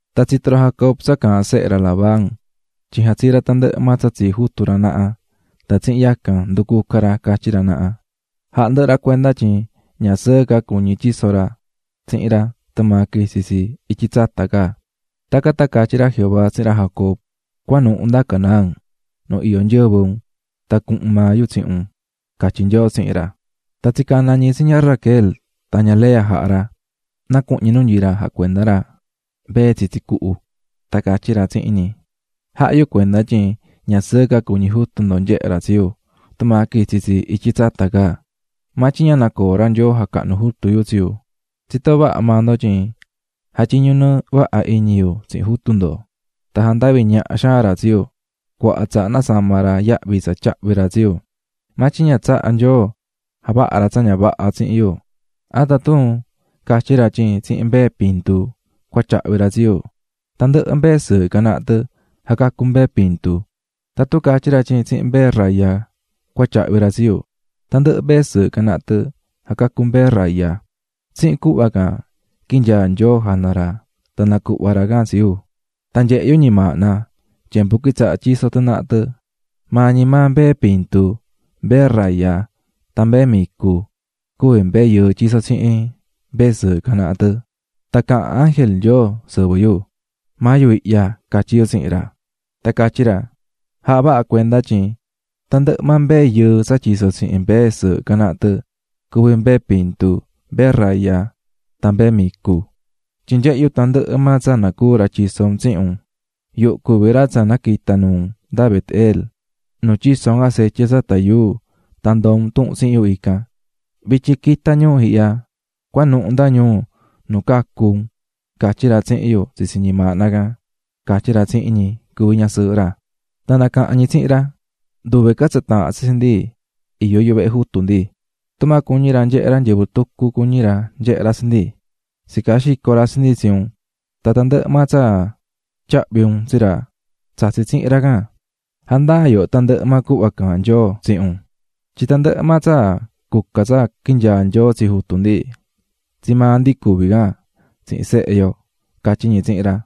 Tan tsito̱ ra Jacob tsa caahán sehe ra Labán tyin jatsii̱ ra tandɨhɨ maa tsa tsii jutu ra naha tan tsihin yacan nducuca̱ ra catyí ra naha. Jahá ndɨhɨ maa ra cuenda tyin ña sɨɨ ca cuñí tyiso ra tsihin ra tumaa quitsi̱ tsi ityi tsata ca. Tacan tan catyí ra Jehová tsihin ra Jacob: "Cua̱nuhu nda Canaán, nu iyó nyɨvɨ un tan cuhun maa yu tsihin un", catyí Nyoo tsihin ra. Tan tsicana̱ ñi tsi ña Raquel tan ña Lea jaha̱ ra na cuhun ñi nu nyií ra jacuendá ra mbee tsitsi cuhu, tan catyí ra tsihin ñi: --Jahá yu cuenda tyin ña sɨɨ ca cuñí jutu ndo nyehé ra tsi yu tumaa quitsi tsi ityi tsata ca, maa tyin ña nacoó Nyoo jacahnú jutu yu tsi yu. Tsitó vaha maa ndo tyin jatyiñu̱ nɨɨ vaha iñi yu tsihin jutu ndo, tan jandavi̱ ñaha xaan ra tsi yu, cuaha tsaha nasama̱ ra yahvi tsa tyahví ra tsi yu, maa tyin ña tsahá Nyoo javaha ra tsa ña vaha tsihin yu. Aan, tatun catyí ra tyin tsihin mbee pintu cua tyahvi ra tsi yu, tandɨhɨ mbee sɨɨhɨ can naha tɨ jacacú mbee pintu, tatun catyí ra tyin tsihin mbee raya cua tyahvi ra tsi yu, tandɨhɨ mbee sɨɨhɨ can naha tɨ jacacú mbee raya. Tsihin cuhva can quinyaa̱ Nyoo jana ra tan nacuhva̱ ra can tsi yu. "Tan nyehe̱ yu ñimaahna tyembu quitsaha̱ tyiso tɨ naha tɨ, maa ñi maa mbee pintu, mbee raya tan mbee micu cuví mbee yɨɨ tyisó tsihin mbee sɨɨhɨ can naha tɨ. Tan caha̱n ángel Nyoo sɨvɨ yu. ꞌMaa yu ihyaꞌ, catyí yu tsihin ra. Tan catyí ra: ꞌJa̱ha vaha cuenda tyin tandɨhɨ maa mbee yɨɨ tsa tyisó tsihin mbee sɨɨhɨ can naha tɨ, cuví mbee pintu, mbee raya tan mbee micu, tyin nyehé yu tandɨhɨ maa tsa nacuú ra tyiso un tsihin un. Yuhu cuví ra tsa naquita̱ nuu un nda Bet-el, nu tyiso̱ un acetye tsata yuu tan ndoo̱ un tuhun tsihin yu ican. Vityin, qui̱ta ñuu ihya, cua̱nuhu nda ñuu nu cacu̱ unꞌ, catyí ra tsihin yu tsitsi ñimaahna can ―catyí ra tsihin ñi cuví nasɨɨhɨ ra. Tan nacaha̱n ñi tsihin ra: --Nduve ca tsa taahán tsi tsi ndi iyó yuvehe jutu ndi. Tumaa cuñí ra nyehé ra nyɨvɨ tucu cuñí ra nyehé ra tsi ndi, tsicaa xico̱ ra tsi ndi tsi un tan tandɨhɨ maa tsa tyahvi̱ un tsi ra tsatsi̱ tsihin ra can. Ja̱ndaa yooho tandɨhɨ maa cuhva caahán Nyoo tsihin un tyin tandɨhɨ maa tsa cuca tsa quinyaa̱ Nyoo tsi jutu ndi, tsii maa ndi cuví can tsihin sehe yo --catyí ñi tsihin ra.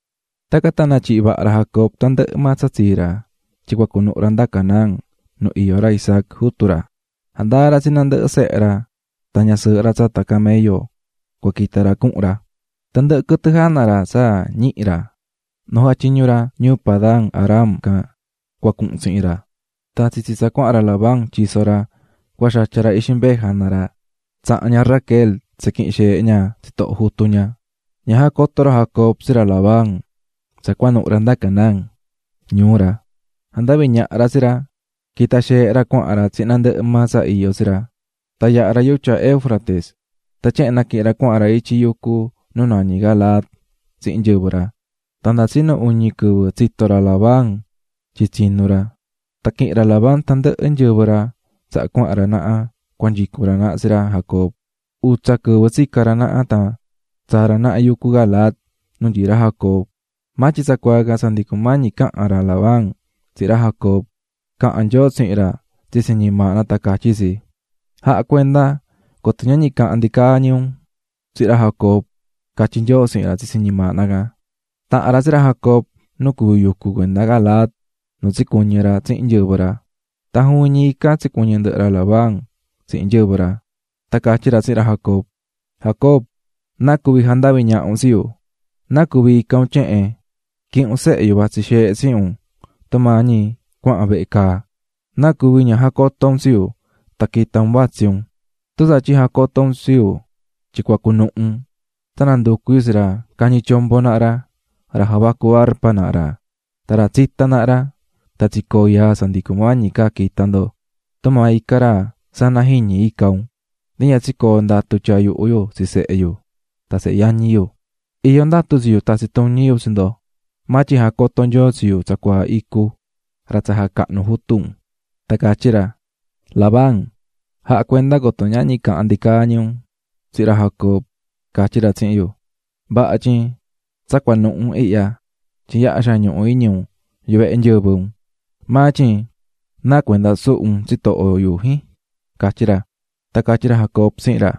Tacan tan natyihi̱ vaha ra Jacob tandɨhɨ maa tsa tsii ra tyin cua cunuhu ra nda Canaán nu iyó ra Isaac, jutu ra. Jandaa̱ ra tsi nandɨhɨ sehe ra tan ñasɨɨhɨ ra tsata camello cua quita ra cuhun ra. Tandɨhɨ quɨtɨ jana ra tsa ñihi̱ ra nu jatyiñu̱ ra ñuu Padan-aram can cua cuhun tsihin ra. Tan tsitsi tsa cuahan ra Labán, tyiso ra, cua xatya ra ixi mbee jana ra, tsaha̱n ña Raquel tsiquihi̱n xeehe ña tsitoho jutu ña. Ña jacoto̱ ra Jacob tsi ra Labán tsa cua cunuhu ra nda Canaán, ñuu ra. Jandavi̱ ñaha ra tsi ra. Quita̱ xeehe ra cuahan ra tsihin tandɨhɨ maa tsa iyó tsi ra, tan yaha̱ ra yutya Éufrates tan tyehen naquihi̱n ra cuahan ra ityi yucu nu nañí Galaad tsihin nyɨvɨ ra. Tan nda tsinu uñi quɨvɨ tsito̱ ra Labán, tyin tsinu̱ ra. Tan quihi̱n ra Labán tandɨhɨ nyɨvɨ ra tsaha cuahan ra naha cua nyicun ra naha tsi ra Jacob, utsa quɨvɨ tsica̱ ra naha tan tsaa̱ ra naha yucu Galaad nu nyií ra Jacob. Maa tyin tsacuaa can tsa ndi cumañi caha̱n ra Labán tsihin ra Jacob, caha̱n Nyoo tsihin ra tsitsi ñimaahna tan catyí tsi: "Ja̱cuenda coto ñahñi cahan ndicaa ñi un tsihin ra Jacob", catyí Nyoo tsihin ra tsitsi ñimaahna can. Taha̱n ra tsi ra Jacob nu cuví yucu cuenda Galaad nu tsicuɨñɨ̱ ra tsihin nyɨvɨ ra, tan juvin ñi ican tsicuɨñɨ̱ ndɨhɨ ra Labán tsihin nyɨvɨ ra. Tan catyí ra tsihin ra Jacob: --¡Jacob! ¿Náa cuvi̱ jandavi̱ ñaha un tsi yu? ¿Náa cuví ica̱ un tyehen?, quihi̱n un sehe yu vatsí xeehe tsihin un tumaa ñi cuahan vehe caa. ¿Náa cuvi̱ ña jacoto̱ un tsi yu tan quita̱ un vatsí un?, tun tsatyin jacoto̱ un tsi yu tyin cua cunuhu un, tsa nanducu̱ yu tsi ra cañí tyombo naha ra, ra javacú arpa naha ra tan ra tsitá naha ra, tan tsicoo̱ yaa tsa ndi cumañi ca quita ndo. Tumaa icá ra sana jiñi ica̱ un, ndi ña tsicoo̱ ndatu tyaa yuhu yu tsi sehe yu tan sehe yañi yu. Iyó ndatu tsi yu tatsi tuñi yu tsi ndo; maa tyin jacoto̱ Nyoo tsi yu tsacuaa icu, ra tsa jacahnú jutu un, tan catyí ra: ꞌLabán, ja̱cuenda coto ñahñi cahan ndicaa ñi un tsihin ra Jacobꞌ, catyí ra tsihin yu. Vaha tyin tsa cuanuhu un ihya tyin yaha xaan ñuhu iñi un yuvehe nyɨvɨ un. Maa tyin ¿náa cuenda suhu̱ un tsitoho yu, jin? ―catyí ra. Tan catyí ra Jacob tsihin ra: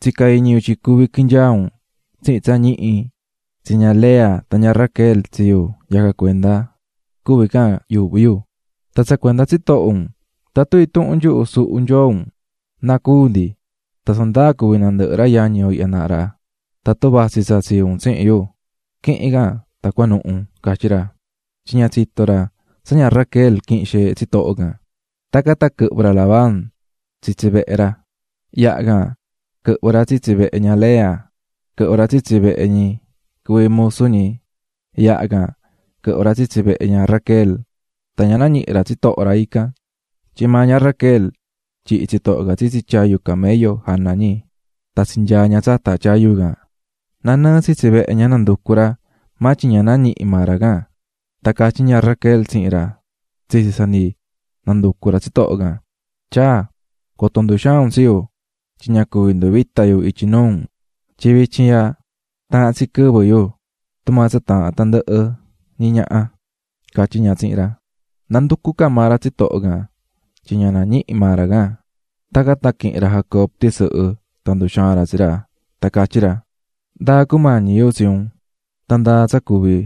--Tsica̱ iñi yu tyin cuvi quinyaa un tsihin tsa ñihi tsi ña Lea tan ña Raquel tsi yu, yacan cuenda cuví can yuuhví yu. Tan tsa cuenda tsitoho un, tatun intuhun nyuhu suhu̱ nyoo un, ¡na cúu ndi! Tsa ndaa cuví nandɨhɨ ra yañi yo ihya naha ra tatun vatsí tsa tsii un tsihin yu, qui̱hin can tan cua̱nuhu ―catyí ra. Tyin ña tsitó ra tsa ña Raquel quihi̱n xeehe tsitoho can. Tacan tan quɨhvɨ̱ ra Labán tsisi vehe ra, yaha can quɨhvɨ̱ ra tsitsi vehe ña Lea, quɨhvɨ̱ ra tsitsi vehe ñi cuví musu ñi, yaha can quɨhvɨ̱ ra tsitsi vehe ña Raquel tan ña nañihi̱ ra tsitoho ra ican. Tyin maa ña Raquel tyihi̱ tsitoho can tsitsi tyayu camello jana ñi tan tsinyaa̱ ña tsata tyayu can. Nanɨɨ tsitsi vehe ña nanducu̱ ra maa tyin ña nañihi̱ maa ra can. Tan catyí ña Raquel tsihin ra tsitsi tsa ndi nanducú ra tsitoho can: --Tyaa, coto nduxaan un tsi yu, tyin ña cuvi nduvita yu ityi nuu un tyin vityin ihya taha̱n tsi quɨvɨ yu tumaa tsa taahán nandɨhɨ ñi ñaha ―catyí ña tsihin ra. Nanducú ca maa ra tsitoho can tyin ña nañihí maa ra can. Tacan tan quihi̱n ra Jacob tisɨhɨ tan nduxaa̱n ra tsi ra tan catyí ra: --¿Ndáa cumañi yu tsi un? Tan ¿ndáa tsa cuví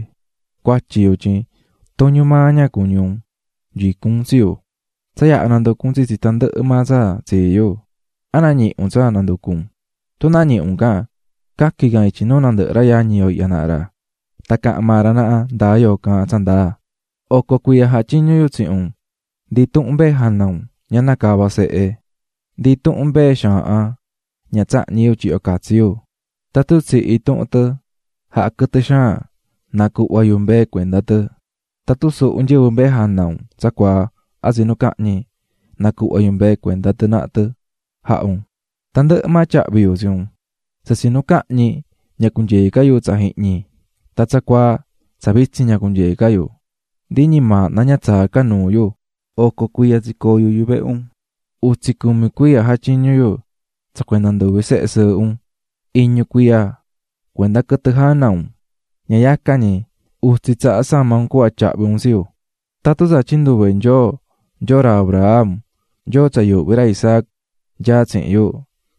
cuatyi yu tyin tuñu maa ña cuñí un nyicún un tsi yu? Tsa yaha̱ nanducu̱ un tsitsi tandɨhɨ maa tsa tsii yu, ¿a nañihi̱ un tsa nanducú un? Tun nañihi̱ un can, ca̱quin can ityi nuu nandɨhɨ ra yañi yo ihya naha ra tan cahan maa ra naha ndáa yoo caahán tsa ndaa. Oco cuiya jatyiñu̱ yu tsihin un, ndi intuhun mbee jana un ña nacava̱ sehe, ndi intuhun mbee xaahan ña tsahñi̱ yu tyihyo catsi yu. Tatun tsihi̱ intuhun tɨ jaha̱ quɨtɨ xaan, nacuhva̱ yu mbee cuenda tɨ, tatun suhu̱ nyɨvɨ mbee jana un tsacuaa a tsinu cahñi, nacuhva̱ yu mbee cuenda tɨ naha tɨ jaha̱ un, tandɨhɨ maa tyahvi̱ yu tsi un. Tsa tsinu cahñi, ña cunyee ca yu tsa ihñi, tan tsacuaa tsa vitsin ña cunyeé ca yu, ndi ñimaahna ña tsaá ca nuu yu. Oco cuiya tsicoo̱ yu yuvehe un: Utsi cumi cuiya jatyiñu̱ yu tsa cuenda nduvi sehe sɨɨhɨ un, iñu cuiya cuenda quɨtɨ jana un, ña yacan ñi utsi tsaha sama̱ un cuhva tyahvi̱ un tsi yu. Tatun tsa tyin nduve Nyoo, Nyoo ra Abraham, Nyoo yuuhví ra Isaac, nyaá tsihin yu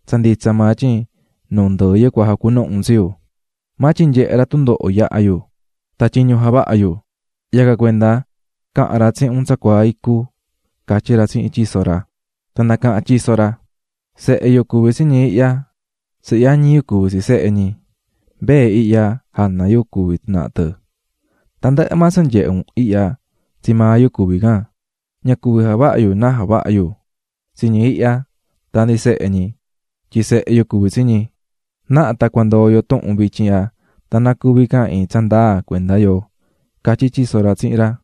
tsa nditsa maa tyin nu ndɨɨ yu cua jacunuhu un tsi yu, maa tyin nyehe̱ ra tundoho yaha̱ yu tan tyiñu javahá yu, yacan cuenda caha̱n ra tsihin un tsacuaa icu ―catyí ra tsihin tyiso ra. Tan nacaha̱n tyiso ra: --Sehe yu cuví tsi ñi ihya, sehe yañi yu cuví sehe ñi, mbee ihya jana yu cuví tɨ naha tɨ, tandɨhɨ maa tsa nyehé un ihya tsii maa yu cuví can, ña cuvi javaha yu náa javaha yu tsi ñi ihya tan ndi tsi sehe ñi tyin sehe yu cuví tsi ñi, na̱ha tan cua ndoo yo tuhun vityin ihya, tan na cuvi can iin tsa ndaa cuenda yo ―catyí tyiso ra tsihin ra.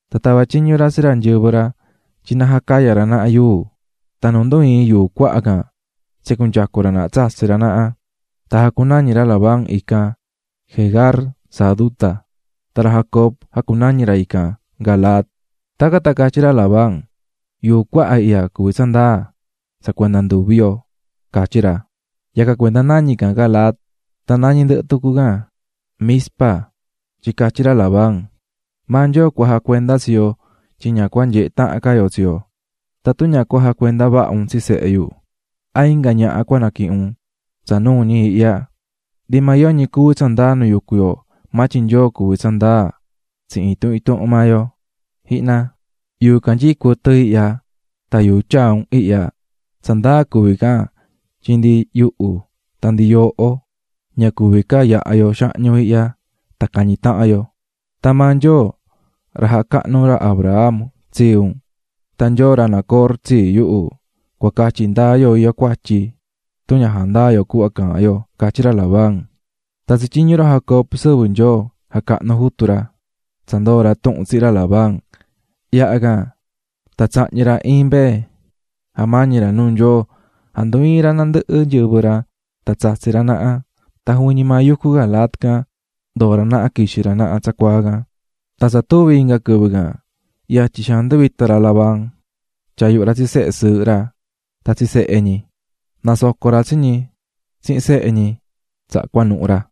Tan tava̱ tyiñu ra tsi nyɨvɨ ra, na jacaya ra naha yuu. Tan nu ndu ii̱n yuu cuaha can tsinyacu̱ ra naha tsatsi̱ ra naha. Tan jacunañi̱ ra Labán ican "Jegar Sahaduta", tan ra Jacob jacunañi̱ ra ican "Galaad". Tacan tan catyí ra Labán: --Yuu cuaha ihya cuví tsa ndaa tsa cuenda nduvi yo ―catyí ra. Yacan cuenda nañí can Galaad; tan nañí ndɨhɨ tucu can Mizpa tyin catyí ra Labán: --Maa Nyoo cua jacuenda tsi yo tyin ña cua nyehe tahan ca yoo tsi yo. Tatun ña cua jacuenda vaha un tsi sehe yu, a inga ñaha cua naquihin un tsa nuu ñi ihya, ndi maa yoñi cuví tsa ndaa nu yucú yo, maa tyin Nyoo cuví tsa ndaa tsihin intuhun intuhun maa yo. "Ji̱hna, yuu canyií cuɨtɨ ihya tan yuu tyaa̱ un ihya, tsa ndaa cuví can tyin ndi yuhu tan ndi yooho ña cuvi ca yaha yo xahñu ihya tan cañi tahan yo. Tan maa Nyoo ra jacahnu̱ ra Abraham tsii un tan Nyoo ra Nacor tsii yuhu cua catyi ndaa yo iyó cuatyi, tun ña jandaa yo cuhva caahán yo ―catyí ra Labán. Tan tsatyiñu̱ ra Jacob sɨvɨ Nyoo jacahnu jutu ra tsa ndoo̱ ra tuhun tsihin ra Labán. Yaha can, tan tsahñi̱ ra iin mbee jamañi̱ ra nuu Nyoo, jandu ii̱n ra nandɨhɨ nyɨvɨ ra tan tsatsi̱ ra naha, tan juvin ñi maa yucu Galaad can ndoo̱ ra naha quixi̱ ra naha tsacuaa can. Tan tsa tuvi̱ inga quɨvɨ can yatyi xaan nduvita̱ ra Labán, tyaa̱ yuhu ra tsi sehe sɨɨhɨ ra tan tsi sehe ñi. Nasoco̱ ra tsi ñi tsihin sehe ñi, tsaha cuanuhu̱ ra.